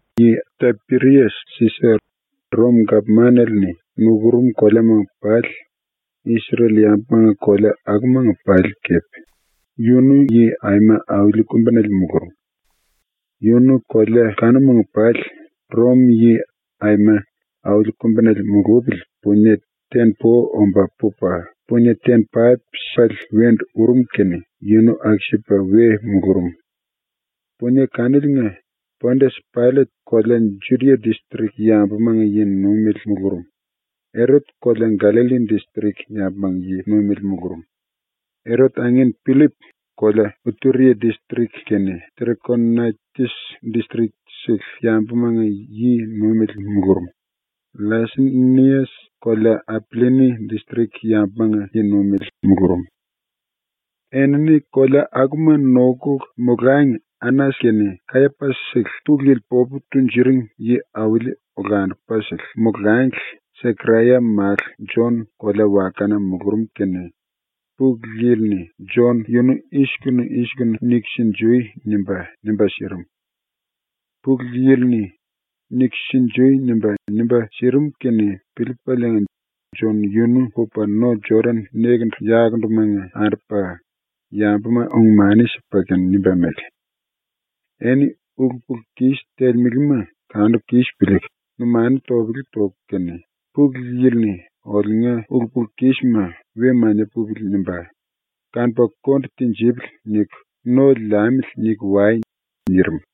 Yi Tapirias-Sisa, Rom-gapmanale-ni nukurum koleamanga pali, Isrel-yambumanga kolea akumanga pali kepe, yunu yi aima auli kumbinale mulurum. Yunu kolea kanumanga pali Rom-yi aima auli kumbinale mulupili punie ten-po omba pupa punie ten-paip sipale wendu urum kene yunu aku-sipa we mulurum. Punie kaniliinga Pondias-Paillet kolea Judia distrik yambumanga yi-nuimele mulurum; Erot kolea Gallalli distrik yambumanga yi-nuimele mulurum; Erot angin Pillip kolea Ituria distrik kene Terekonaitis distrik-sele yambumanga yi-nuimele mulurum; LLaisenias kolea Apillini distrik yambumanga yi-nuimele mulurum. Enini kolea akuma nokuku molangi Anas kene Kayapas-sele Pulu Yili popu tunjuring yi-auli olandupasele molangli Sekaraya málu Jon kolea-wakana mulurum kene Pulu Yili-ni Jon yunu “I-sikunu i-sikunu niku sinjui.” nimba, nimba sirim. Pulu Yili-ni “Niku sinjui.” nimba, nimba sirim kene piliipaliinga Jon yunu pupa no-Jodan nekendu-yakundumanga andupa yambuma ung-mani sipa kene nimba mele: “Eni ulu-pulu-kis telemelema kanuku kis piliiku numanu topele toku kene ‘Pulu Yili-ni oliunga ulu-pulu-kisma ‘We mania pupili.’ nimba kanupa konde tinjipili.’ niku ‘No liamili.’ niku wai.” nirim.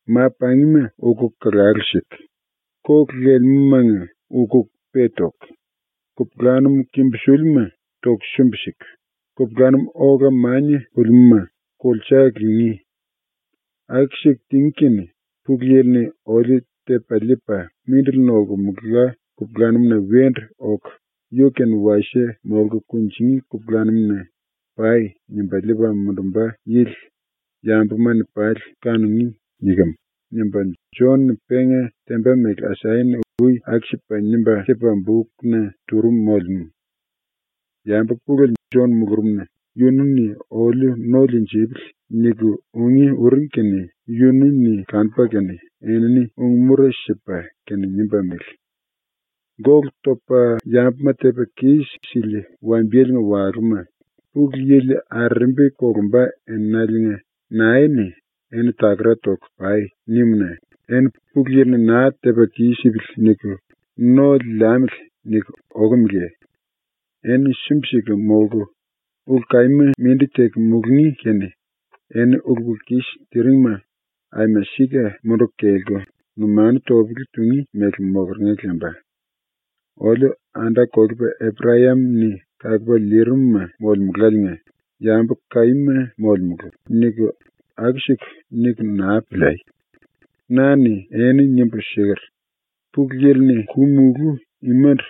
“Ma-pangima ukuku kalalu siku, kolu lelemúmanga ukuku pe toku, kupulanum kimbusilima toku sumbi-siku, kupulanum ola mania pulimúma kulsa lingí. Aku-siku tingí kene Pulu Yili-ni oliu tepa liipa ‘Mindili nolkemela kupulanum-na wendu oku yu-kene wasie molku kunjingí kupulanum-na pai.’ nimba liipa mundumba yili yambuma-ni pali kanungí.” nikem.” nimba ⸤Jon-ni penga temba mele Asaya-ni ui aku-sipa nimba sipa bukna turum molemú.⸥ Yambu pulele Jon mulurumna ‘Yunu-ni oliu no liinjipili.’ niku ungí uring kene yunu-ni kanupa kene, enini ung-mura sipa kene nimba mele: “Gólu topa yambuma tepa kis-sili wambiyelenga walúma, Pulu Yili arerembi kolumba enaliinga nae-ni “Eni takara toku pai.” nimu-na eni ‘Pulu Yili-ni naa tepa kis-sipili.’ niku ‘No liamili.’ niku okumeleye? Eni sumbi-siku molku, ulu kaíma mindi teku mulungí kene eni ulu-pulu-kis tiringma aima sika munduku kelku numanu topele tungí mele mokeringa lemba. “Oliu anda-kolepa Eprayam-ni kalupa liirimuma molemuláliinga yambu kaíma molemulu.” niku aku-siku niku naa piliai. Na-ni eni nimbu siker: ‘Pulu Yili-ni ku-mulú imandu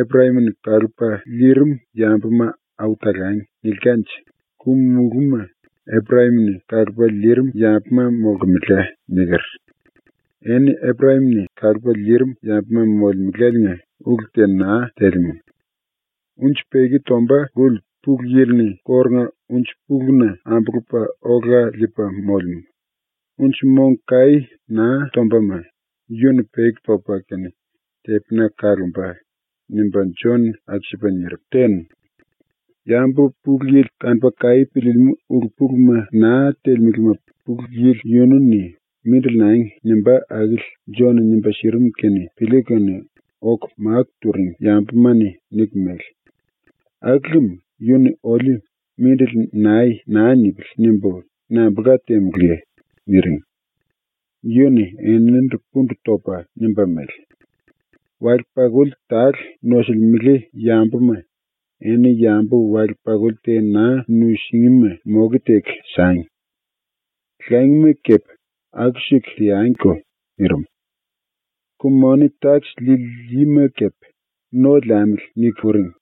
“Eprayam-ni kalupa liirim yambuma au talangi.” nilkanje ku-mulúma Eprayam-ni kalupa liirim yambuma molkemela.’ niker. Eni Eprayam-ni kalupa liirim yambuma molemeláliinga ulu te naa telemú. “Unji peki tomba luli Pulu Yili-ni kórunga unji-puluna ambulupa ola liipa molemú. Unji mong kaí naa tombama yu-ni peki topa kene tepina kalomba.” nimba Jon-ni aku-sipa nirim. ⸤Yambu Pulu Yili kanupa kaí piliilimú ulu-puluma naa telemelema Pulu Yili yunu-ni “Mindili nangi.” nimbá akili Jon-ni nimba sirim kene piliiku kene⸥ oku máku turing yambuma-ni niku mele: “Aku lem ⸤‘Yu-ni oliu “Mindili nai.” naa nipili.’ nimbu⸥ nambulka temulúye?” niring. Yu-ni eninindu pundu topa nimba mele: “Wale-pakuli tale nosulimele yambuma eni yambu wale-pakuli te naa nusingíma moke teku sangi. Langima kepe aku-siku teangiko.” nirim. Ku-moni-takis liili yima kepe ‘No liamili.’ niku uring.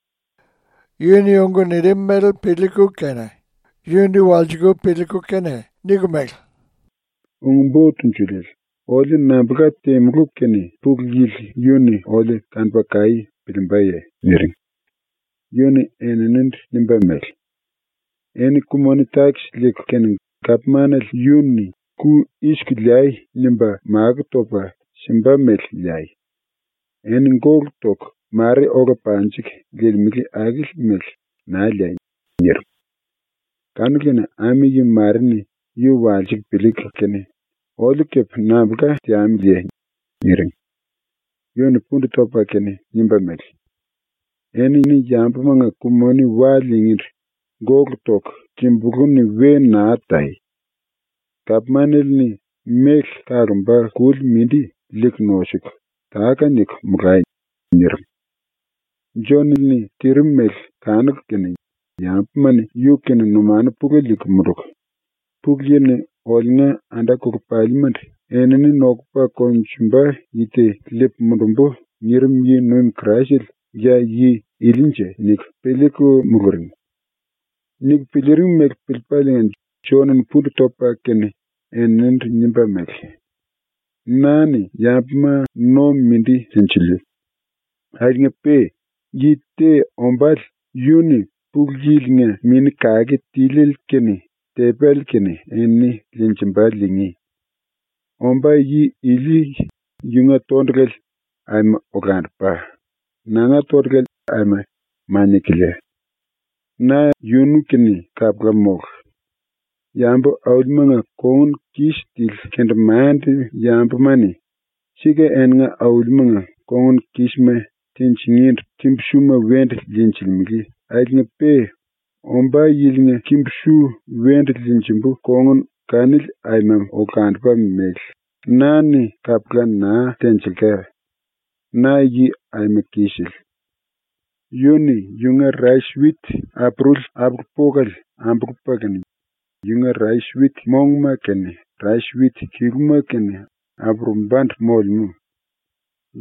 Yu-ni ung nirim mele piliiku kene yundu walsiku piliiku kene niku mele: “Ung-Bo Tunjuliele, oliu nambulka temulú kene Pulu Yili yu-ni oliu kanupa kaí piliimbaye?” niring. Yu-ni eninindu nimba mele: “Eni ku-moni-takis liiku kene gapmanale yu-ni “Ku i-siku liai.” nimba makó topa simba mele liai. Eni gólu toku mare ola panjiku liilimele akili mele naa liai.” nirim. Kanu-kene ami-yi mare-ni yu walsiku piliiku kene, “Oliu kepe nambulka teamiliye?” niring. Yu-ni pundu topa kene nimba mele: “Eni yambumanga ku-moni wa liingíndu gólu toku kimbulú-ni we naa tai. Gapmanale-ni méle kalomba kuli mindi liiku nosuku, táka-niku molai.” nirim. Jon-ni tirim mele kanuku kene yambuma-ni yu-kene numanu pulele liiku munduku, ‘Pulu Yili-ni oliunga anda-kolepalimandu “Enini nokupa konjumba yi te liipu mundumbu.” nirim yi-nuim Kraisele ya yi ilinje?’ niku piliiku muluring. Niku piliiring mele piliipaliinga Jon-ni pundu topa kene eninindu nimba mele: “Na-ni yambuma no mindi liinjiliu. Akiliinga-pe yi te ombále yu-ni ⸤Pulu Yili-nga⸥ Mini Kake Tiliele kene tepéle kene eni liinjimba ⸤liingí⸥. Ombá yi ili yunga tondulale aima olandupa, nanga tondulale aima mania-kilia. Na yunu-kene kapula mólu. ⸤Yambu-aulimanga kongun kis tili kendemande-yambuma-ni sika eninga aulimanga kongun kísma tinjingíndu kimbu-suma wendu liinjilimele akiliinga-pe⸥ ombá yilinga kimbu-su wendu liinjimbu kongun kanili aima olandupa mele na-ni kapula naa tenjilka, na yi aima kisele. Yu-ni yunga rais-wit apuruli apulu-pokale ambulupa kene yunga rais-wit mongma kene rais-wit kiluma kene apurumbandu molemú.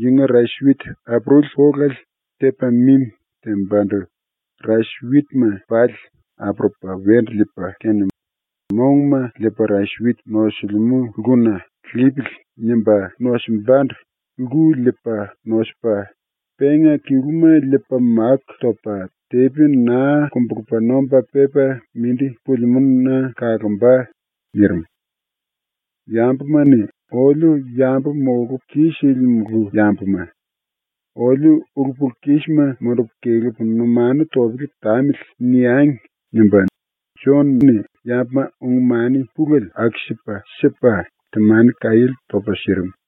Yunga rais-wit apuruli polale tepa mimi tembandu rais-witma pali apurupa wendu liipa kene monguma liipa rais-wit nosilimú lkuna ‘Lipili.’ nimba nosimbandu lku liipa nosupa, penga kiluma liipa máku topa tepi naa kumbulupa nomba pepa mindi pulimúna kalomba.” nirim. ‘Yambuma-ni “Oliu yambu molupu kis-silimulu yambuma. Oliu ulu-pulu-kisma mundupu kelepu numanu topele tamili.” niangi.’ nimba Jon-ni yambuma ung-mani pulele aku-sipa sipa, temani kaiéle topa sirim.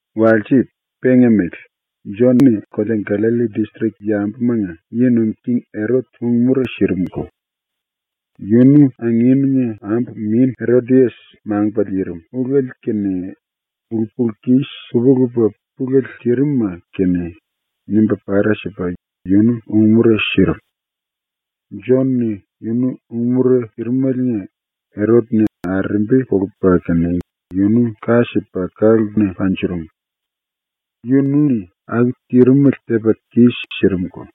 Walse, penga mele, Jon-ni kolea Gallalli distrik yambumanga yi nuim king Erot ung-mura sirimko. Yunu anginunga ambu min Erodias ⸤mangupa liirim⸥ ulele kene ulu-pulu-kis lupa-lupa pulele tirim-ma kene nimba para sipa yunu ung-mura sirim. Jon-ni yunu ung-mura sirimeliinga Erot-ni arerembi kolupa kene yunu ka sipa ka-lkuna panjurum. Yunu-ni aku tirimele tepa kis-sirimko.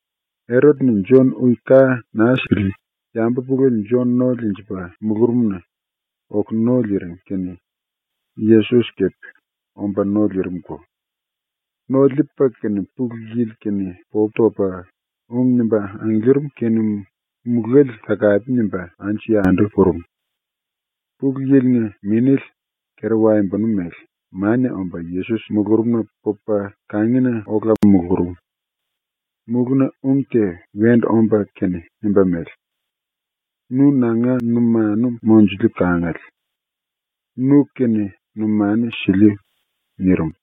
⸤Erot-ni Jon ui ka naa sipili⸥ yambu pulele Jon no liinjipa mulurumna oku no liiring kene Yesos kepe omba no liirimko. No liipa kene Pulu Yili-kene popu topa ung nimba angiliirim kene mulále takape nimba anju-yandu purum. Pulu Yili-nga Minéle, kera-waembonu mele, mania omba Yesos mulurumna pupa ⸤kangina⸥ ola mulurum. Mulúna ung te wendu omba kene nimba mele: “Nu nanga numanu monjuliu kangale. Nu-kene numanu siliu.” nirim.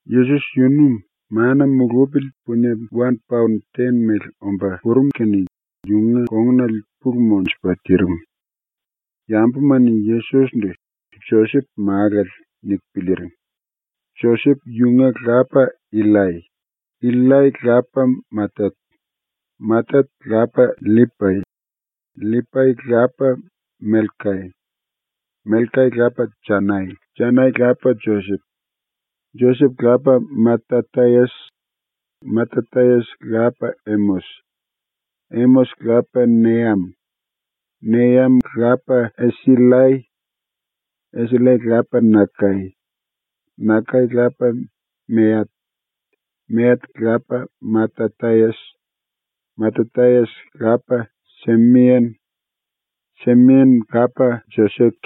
Yesos yunu mana mulupili punie wan paon ten mele omba purum kene yunga kongunale pulu monjupa tirim. Yambuma-ni Yesos-ndu ‘Josep málale.’ niku piliiring. Josep yunga lapa Illai. Illai lapa Matat. Matat lapa LLipai. LLipai lapa Melkai. Melkai lapa Janai. Janai lapa Josep. Josep lapa Matatayas. Matatayas lapa Emos. Emos lapa Neam. Neam lapa Esillai. Esillai lapa Nakai. Nakai lapa Meat. Meat lapa Matatayas. Matatayas lapa Semein. Semein lapa Josek.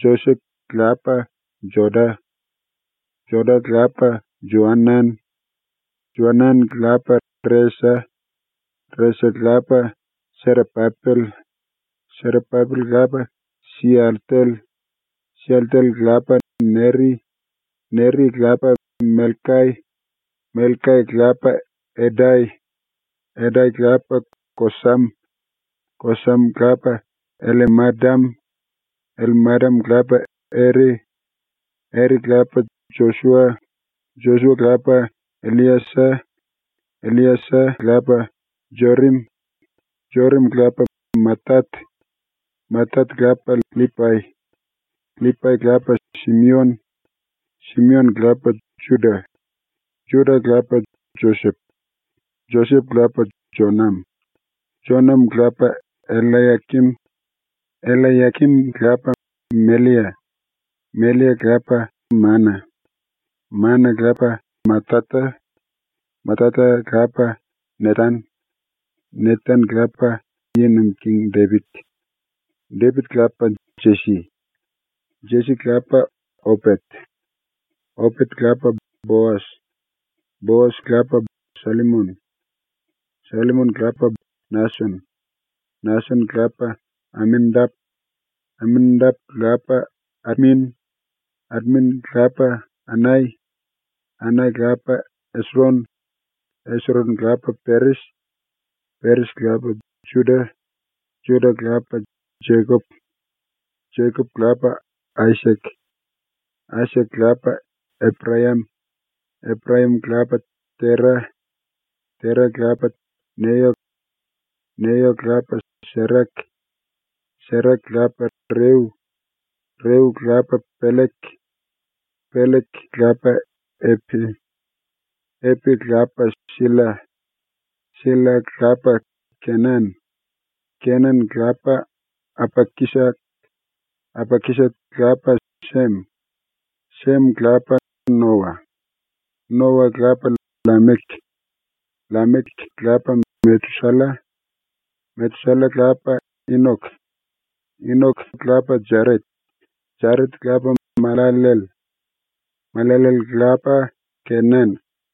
Josek lapa Joda. Joda lapa Joanan. Joanan lapa Resa. Resa lapa Serapapel. Serapapel lapa Sialtel. Sialtel lapa Neri. Neri lapa Melkai. Melkai lapa Edai. Edai lapa Kosam. Kosam lapa Ellemadam. Ellemadam lapa Ere. Ere lapa Josua. Josua lapa Elliesa. Elliesa lapa Jorim. Jorim lapa Matat. Matat lapa LLipai. LLipai lapa Simion. Simion lapa Juda. Juda lapa Josep. Josep lapa Jonam. Jonam lapa Ellayakim. Ellayakim lapa Mellia. Mellia lapa Mana. Mana lapa Matata. Matata lapa Netan. Netan lapa ⸤Yi Nuim King⸥ Depit. Depit lapa Jesi. Jesi lapa Opet. Opet lapa Boas. Boas lapa Sallimon. Sallimon lapa Nason. Nason lapa Aminadap. Aminadap lapa Admin. Admin lapa Anai. Anai lapa Esron. Esron lapa Peres. Peres lapa Juda. Juda lapa Jekop. Jekop lapa Aisak. Aisak lapa Eprayam. Eprayam lapa Tera. Tera lapa Neyo. Neyo lapa Serak. Serak lapa Reu. Reu lapa Pellek. Pellek lapa Epe. Epe lapa Silla. Silla lapa Kenan. Kenan lapa Apakisat. Apakisat lapa Sem. Sem lapa Noa. Noa lapa LLamek. LLamek lapa Metusalla. Metusalla lapa Inok. Inok lapa Jaret. Jaret lapa Mallallell. Mallallell lapa Kenan.